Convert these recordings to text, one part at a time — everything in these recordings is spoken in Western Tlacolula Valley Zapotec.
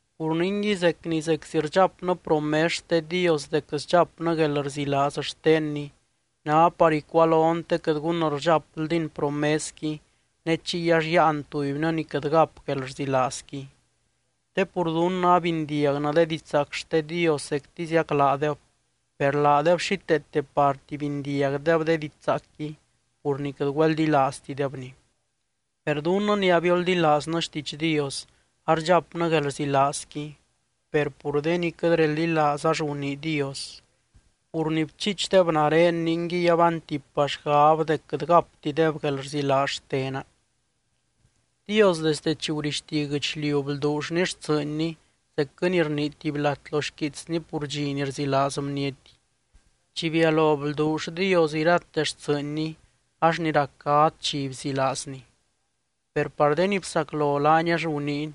Pur ningui, zec ni zeczi rdxapnɨ promes xte Dios dec sdxapnɨ guelrzilaaz xtenny, ná par icualon te quɨt gun rdxapldin promesqui ne chiy ax yáan tubynɨ ni quɨt gap guelrzilaazqui. Te pur dunnɨ abindiagnɨ de didxzaac xte Dios zectiziac laadeb, per laadeb xíteete parti bindiagdeb de didxzaacqui, pur ni quɨt güeldilaaztidebni. Per dunnɨ ni abioldilaaznɨ xtiidx Dios, ardxapnɨ guelrzilaazqui, per pur de ni quɨt reldilaaz ax gunii Dios: Pur ni bchiichdeb nare ninguiy abaantipa xgab dec quɨt gaptideb guelrzilaaz xtena. Dios desde chi gurixti guɨchliu blduullny xtsɨɨnny zecquɨ ni rnii tuby lat lo xquiitsny pur dxi ni rzilaaz bniety: Chi bialo blduull Dios irate xtsɨɨnny, ax ni rac gadz dxi bzilaazny. Per par de ni bsaclo laany ax guniiny: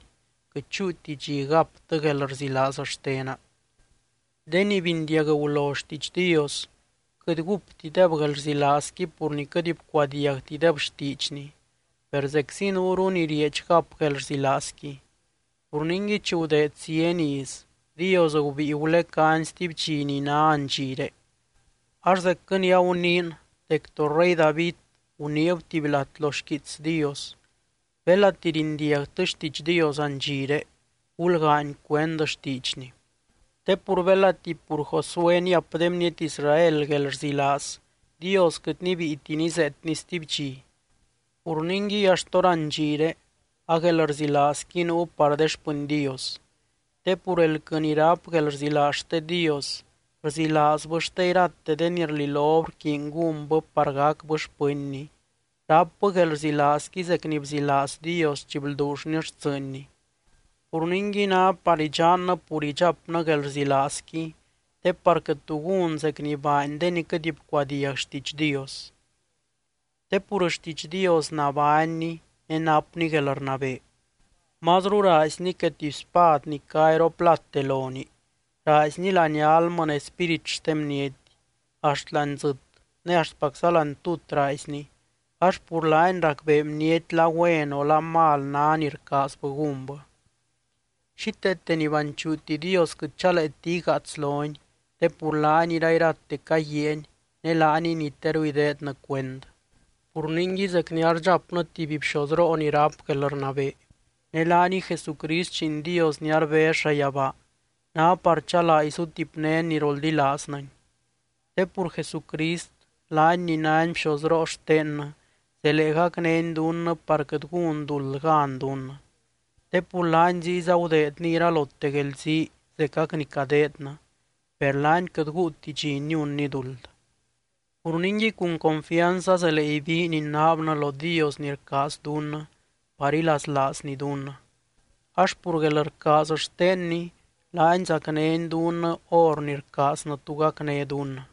Quɨt chúuti dxi gaptɨ guelrzilaaz xtena. De ni bindiag gulo xtiidx Dios, quɨt gúptideb guelrzilaazqui pur ni quɨt bcuadiagtideb xtiidxny, per zeczi nuuru ni rieedx gap guelrzilaazqui. Pur ningui, chi gudeed zieny iz, Dios gubíi gulecány stuby dxi ni ná andxiré. Ax zecquɨ ni aguniin dec to rey David guniib tuby lat lo xquiits Dios: Belati rindiagtɨ xtiidx Dios andxiré, gulgaany cuend xtiidxny. Te pur belati pur Josué niap de bniety Israel guelrzilaaz, Dios quɨt nibíiti nizeetny stuby dxi. Pur ningui axt hórandxire a guelrzilaazqui nuu par de xpɨny Dios. Te pur elquɨ ni ráp guelrzilaaz xte Dios, rzilaazbɨ xte irate de ni rlilob rquiiny gúnbɨ par gacbɨ xpɨnny, rápbɨ guelrzilaazqui zec ni bzilaaz Dios chi blduullny xtsɨɨnny. Pur ningui, ná par idxannɨ pur idxapnɨ guelrzilaazqui te par quɨt tu gún zec ni baany de ni quɨt bcuadiag xtiidx Dios. Te pur xtiidx Dios nabánni ne napni guelrnabee. Mazru raaizni que tuby spad ni cá iroplate lonii, raaizni láani almɨ ne spírit xte bniety. Axt láani dzɨt ne axtpacza láani tut raaizni, ax pur laany racbee bniety la güen o la mal ná ni rcaazbɨ gúnbɨ. Xíteete ni banchuuti Dios quɨt chaleeti igaats lony, te pur laany irairate caguiaany ne laaniy ni teru ideednɨ cuend. Pur ningui, zec ni ardxapnɨ tuby bxozroo ni ráp guelrnabee, ne laaniy Jesucrist Lliin Dios ni arbez llayabaa, ná par chalaa izutipnén ni roldilaaznɨny. Te pur Jesucrist laany ni nány bxozroo xtennɨ zelee gacnény dunnɨ par quɨt gún duld gan dunnɨ. Te pur laany ziyza gudeedny iralote guelzii zecac ni cadeednɨ, per laany quɨt guuti dxi niunny duld. Pur ningui, cun confianz azelee ibiin inaabnɨ lo Dios ni rcaaz dunnɨ par ilaslaazny dunnɨ. Ax pur guelrcaaz xtenny, laany zacnény dunnɨ hor ni rcaaznɨ tu gacné dunnɨ.